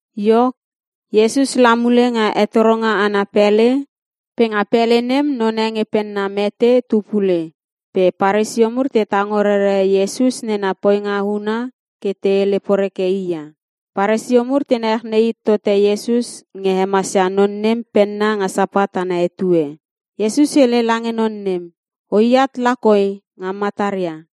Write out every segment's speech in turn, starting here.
Iok Iesus la mule nga hetoronga ana pele, pe nga pele nem none nge penna mete tu pule. Pe Paresio mur te tango rere Iesus nena poinga huna ke te hele poreke i ia. Paresio mur te nechnei it tote Iesus nge hemasia non nem penna nga Sapat ana etue. Iesus hele lange non nem, “O iat la koi nga mataria.”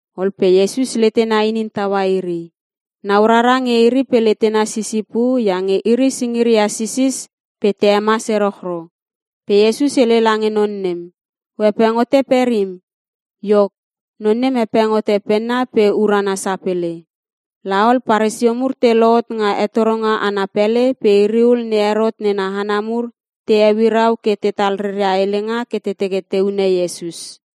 Ol pe Iesus letena inin taua iri. Nau rara nge iri pe letena sisipu iange iri singiria sisis pe te hemas erochro. Pe Iesus hele lange non nem, “O hepeng hote perim.” Iok, non nem hepeng hote penna pe urana sapele. La ol Paresio mur te lohot nga hetoronga ana pele pe iri ul ne Herot nena hana mur te heuirau ke tetal reria helenga ke te teke te hune Iesus.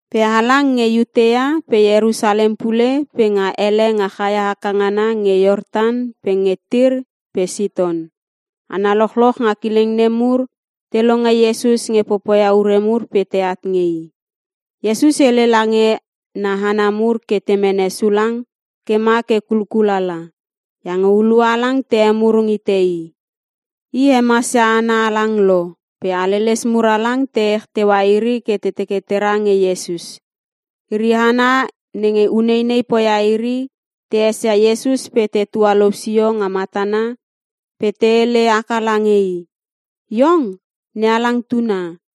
Pe halang nge Iutea, pe Ierusalem pule pe nga ele nga chaia haka ngana nge Iortan pe nge Tir pe Siton. Hana lochloch nga kileng nem mur te longe Iesus nge popoia ure mur pe teat nge I. Iesus hele lange na hana mur ke te mene sulang ke ma ke kulkul ala, iange hulua halang te hemurung hite i. I hemasia hana halang lo pe haleles mur halang te ech teua iri ke te teke tera nge Iesus. Iri hana nenge uneinei poia iri te esia Iesus pe te tualou sio nga matana pe te hele haka lange i, “Iong NeHalang Tuna!”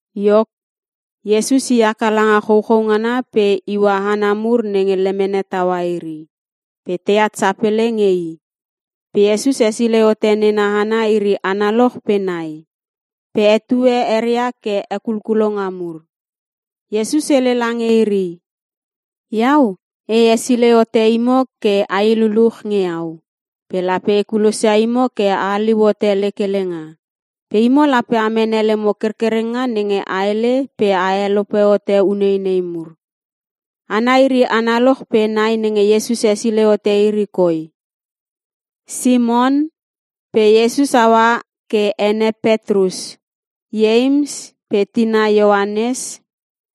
Iok Iesus i haka langa chouchou ngana pe iua hana mur nenge lemene taua iri. Pe teat sapele nge i. Pe Iesus hesilei hote nena hana iri analoch pe nai. Pe hetue eria ke Hekulkulonga mur. Iesus hele lange iri. “Iau e hesilei hote imo ke ai luluch nge iau. Pe lape e kulosia imo ke a haliu hote lek helenga. Pe imo lape a mene lemo kerkerenga nenge a hele pe a helope hote uneinei mur.” Hana iri analoch pe nai nenge Iesus hesilei hote iri koi: Simon, (pe Iesus haua ke ene Petrus), Ieims pe tina Ioanes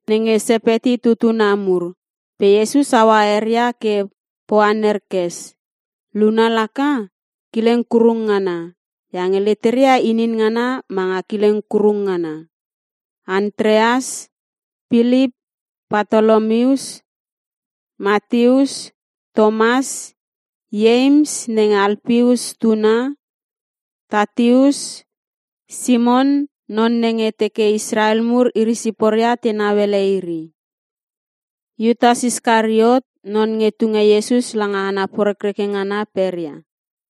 (nenge Sepeti tutuna mur pe Iesus haua eria ke Poanerkes. Luna laka, “kileng kurung ngana” iange leteria inin ngana manga kileng kurung ngana) Antreas Pilip Partolomius Mateus Tomas Ieims (nenge Alpeus tuna) Tateus Simon (non nenge teke Israel mur iri siporia tenau ele iri) Iutas Iskariot, (non nge tunge Iesus langa hana porekreke ngana peria).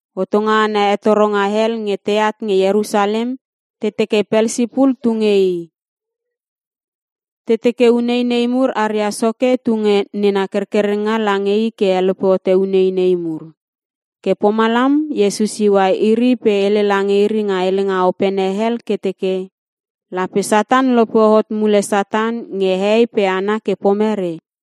Hotonga ana hetoronga hel nge teat nge Ierusalem, te teke Pelsipul tu nge i. Te teke uneinei mur aria soke tunge nena kerkerenga lange i ke helope hote uneinei mur. Ke pomalam Iesus iua iri pe hele lange iri nga helenga opene hel ke teke, “Lape Satan lope hot mule Satan nge hehei pe hana ke pomere?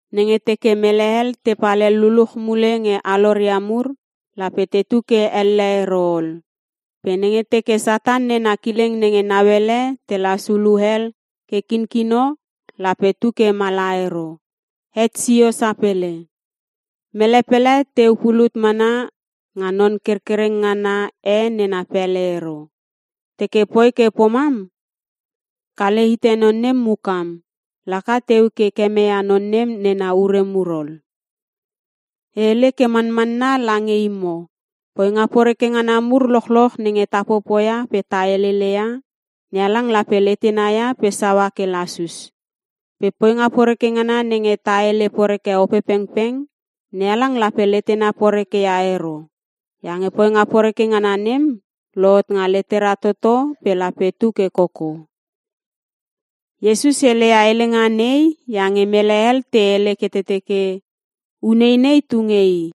Nenge teke mel hel tepal hel luluch mule nge aloria mur lape tetu ke elle ero ol. Pe nenge teke Satan nena kileng nenge nauele telas hulu hel ke kinkino lape tu ke mala ero, het sio sapele. “Mele pele teu pulut mana nga non kerkereng ngana e nena pele ero. Teke poi ke pomam, kale hite non nem mukam, laka teu ke kemeia non nem nena ure mur ol. “E hele ke manmanna lange imo, poinga poreke ngana mur lochloch nenge ta popoia pe ta heleleia, NeHalang lape letena ia pe saua ke lasus. Pe poinga poreke ngana nenge ta hele poreke Opepengpeng, NeHalang lape letena poreke ia ero iange poinga poreke nem lohot nga letera toto pe lape tu ke koko.” Iesus heleia helenga nei iange mele hel te hele ke teke, “Uneinei tu nge i.”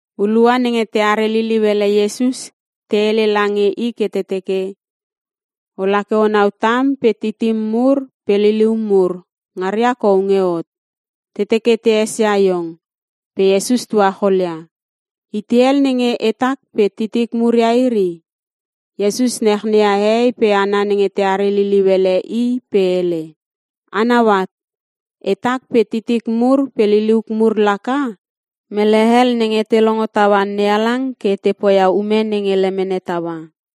Hulua nenge teare liliu ele Iesus te hele lange i ke te teke, “Ola ke o nau tam pe titim mur pe lilium mur ngaria kou nge hot, te teke te esia iong.” Pe Iesus tuacholia, “Itei hel nenge etak pe titik mur ia iri?” Iesus nachneia hehei pe hana nenge teare liliu ele i pe hele, “A nau at, etak pe titik mur pe liliuk mur laka mele hel nenge te longo taua NeHalang ke te poia ume nenge lemene taua.”